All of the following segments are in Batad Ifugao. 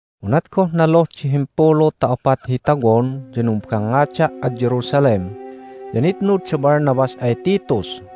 Unat goh naluh di himpulu ta opat hi tawon ya numbangngada' ad Jerusalem, ya nitnud da Barnabas ay Titus.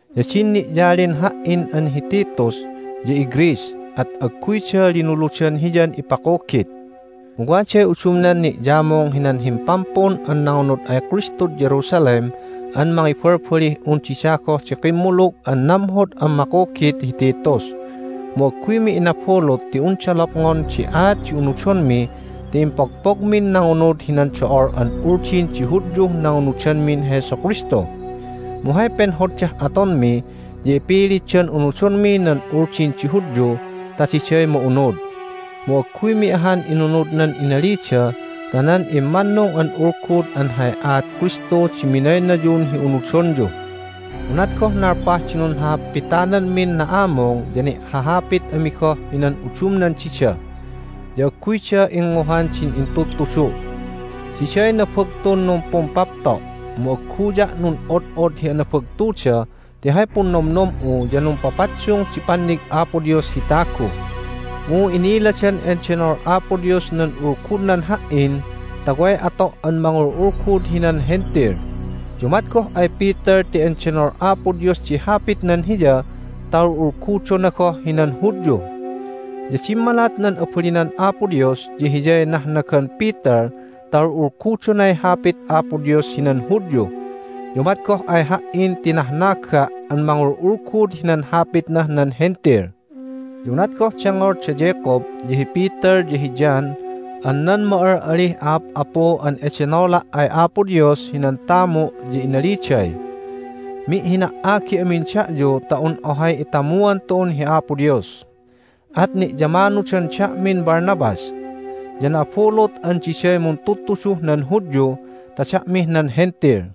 Ya din ni'yalin ha"in an hi Titus ya iGreece, at agguyda linuludan hiyan ipakugit. Mu waday udumnan ni'yamung hinan himpampun an nangunud ay Kristud Jerusalem an mangibalbalih un dida goh di kimmulug an namhod an makugit hi Titus, mu agguymi inabulut ti unda lopngon di aat di unudonmi ti impogpogmin nangunud hinan do'ol an Uldin di Hudyuh nangunudanmin Jesu Kristu. Mu hay penhoddah atonmi ya ipilitdan unudonmi nan Uldin di Hudyu ta diday ma'unud. Mu agguymi ahan inunud nan inalida ta nan immannung an Ulgud an hay aat Kristu di minaynayun hi unudonyu. Unat goh nalpah di nunhahapitanmin na'amung ya ni'hahapit ami goh hinan udumnan dida, ya agguyda ingnguhan din intudtudu'. Diday nabagtun numpumpapto', mu agguya' nun'od'od hi anabagtuda ti hay punnomnom'u ya numpapaddung di pannig Apo Dios hi tagu. Mu inniladan endenol Apo Dios nan Ulgudnan ha"in ta way ato' an mangul'ulgud hinan Hentil. Ya umat goh ay Peter ti endenol Apo Dios di Hapitnan hiya ta ul'ulgudona goh hinan Hudyu, ya dimmalat nan abalinan Apo Dios ya hiyay nahnagan Peter ta ul'ulgudonay Hapit Apo Dios hinan Hudyu. Ya umat goh ay ha"in ti nahnaga' an mangul'ulgud hinan Hapitnah nan Hentil. Ya unat goh dengngol da Jacob, ya hi Peter, ya hi John an nan ma'al'alih a'ap'apu an edenola' ay Apo Dios hinan tamu' ya inaliday, "Mi'hina"agi amin da'yu ta un ohay itamuan tu'un hi Apo Dios!" At ni'yamanudan da'min Barnabas. Ya na'abulut an diday muntudtuduh nan Hudyu ta da'mih nan Hentil.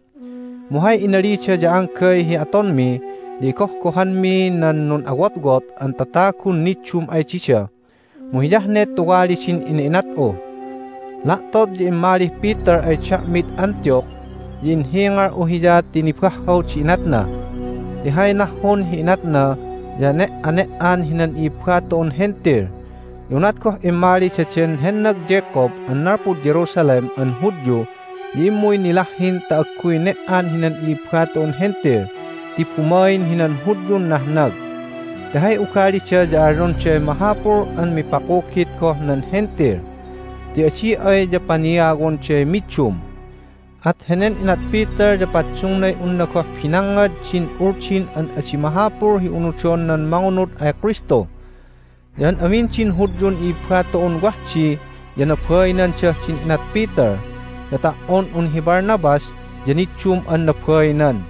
Mu hay inalida ya anggay hi atonmi ya igohgohanmi nan nun'awotwot an tatagun niddum ay dida, mu hiyah ne tuwali din ina'inat'u. La'tot ya immalih Peter ay da'mid Antioch. Ya inhingal'u hiya ti nibahhaw di inatna ti hay nahhun hi inatna ya ne"ane"an hinan i'ibba tu'un Hentil. Ya unat goh immali daden hennag Jacob an nalpud Jerusalem an Hudyu ya immuy nilahhin ta agguy ne"an hinan i'ibba tu'un Hentil ti bumain hinan Hudyun nahnag. Ti hay ugalida ya alyonday mahapul an mipakugit goh nan Hentil, ti adi ay ya paniawonday middum. At henen inat Peter ya paddungnay unna goh binangngad din Uldin an adi mahapul hi unudon nan mangunud ay Kristu! Ya an amin din Hudyun i'ibba tu'un wah di ya nabainandah din inat Peter, ya ta"on un hi Barnabas ya niddum an nabainan.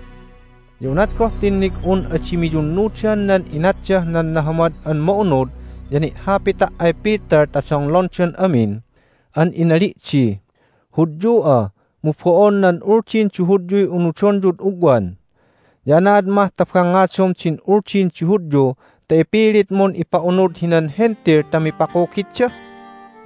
Ya unat goh tinnig'un adi miyunnudan nan inatdah nan Nahamad an Ma'unud ya ni'hapita' ay Peter ta donglondan amin, an inali' di, "Hudyu'a, mu bo'on nan Uldin di Hudyuy unudonyud ugwan! Ya anaad mah ta bangngadom din Uldin di Hudyu ta ipilitmun ipa'unud hinan Hentil ta mipakugitda?"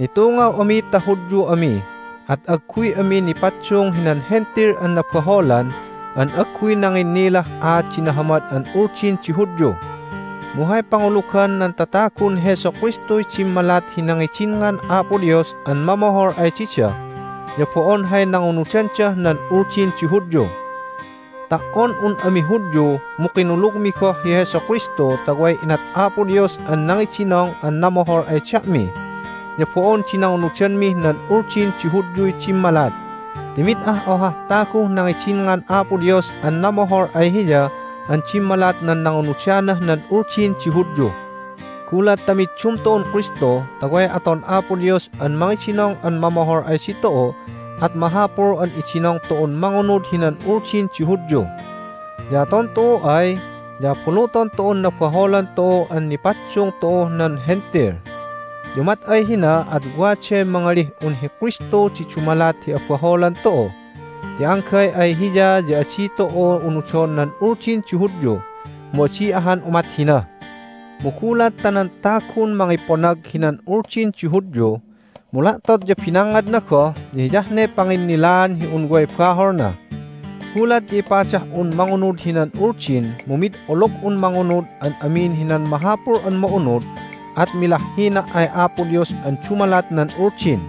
Nitungaw ami ta Hudyu ami, at agguy ami nipaddung hinan Hentil an nabaholan an agguy nanginnilah aat di nahamad an Uldin di Hudyu. Mu hay pangulugan nan tatagun Jesu Kristuy dimmalat hi nangidinngan Apo Dios an mamohol ay dida, ya bo'on hay nangunudandah nan Uldin di Hudyu. Ta"on un ami Hudyu mu kinulugmi goh hi Jesu Kristu ta way inat Apo Dios an nangidinong an namohol ay da'mi, ya bo'on di nangunudanmih nan Uldin di Hudyuy dimmalat, ti mid ah ohah taguh nangidinngan Apo Dios an namohol ay Hiya an dimmalat nan nangunudanah nan Uldin di Hudyu. Gulat ta middum tu'un Kristu ta way aton Apo Dios an mangidinong an mamohol ay ditu'u at mahapul an idinong tu'un mangunud hinan Uldin di Hudyu. Ya aton tu'u ay ya abuluton tu'un nabaholan tu'u an nipaddung tu'uh nan Hentil. Ya umat ay hina at waday mangalih un hi Kristu di dumalat hi abaholan tu'u, ti anggay ay Hiya ya adi tu'u unudon nan Uldin di Hudyu, mu adi ahan umat hina! Mu gulat ta nan tagun mangiponag hinan Uldin di Hudyu, mu la'tot ya binangngadna goh ya hiyah ne panginnilaan hi un way baholna. Gulat ya ipadah'un mangunud hinan Uldin mu mid olog'un mangunud an amin hinan mahapul an ma'unud at milahhina' ay Apo Dios an dumalat nan Uldin.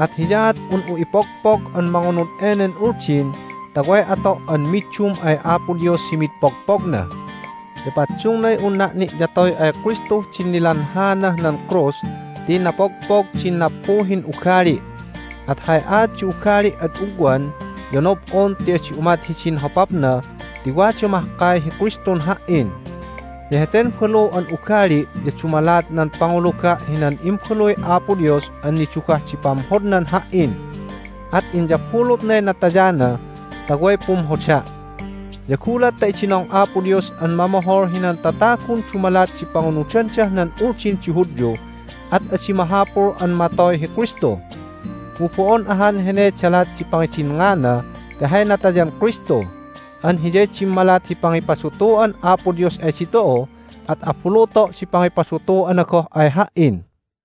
At hiyaat un'u ipogpog an mangunud enen Uldin ta way ato' an middum ay Apo Dios hi mid pogpogna. Ya paddungnay unna' ni'yatoy ay Kristuh din nilanhaanah nan krus ti napogpog din nappuhin ugali'. At hay aat di ugali' ad ugwan ya nob'on ti adi umat hidin hopapna ti wada mahkay hi Kristun ha"in. Ya heten balu an ugali' ya dumalat nan panguluga' hinan Imbaluy Apo Dios an nidugah di pamhodnan ha"in. At inyabulutnay natayana ta way pumhoda'. Ya gulat ta idinong Apo Dios an mamohol hinan tatagun dumalat di pangunudandah nan Uldin di Hudyu at adi mahapul an matoy hi Kristu! Mu bo'on ahan heney dalat di pangidinngana ti hay natayan Kristu! An hiyay dimmalat hi pangipadutu'an Apo Dios ay ditu'u, at abuluto' di pangipadutu'ana goh ay ha"in.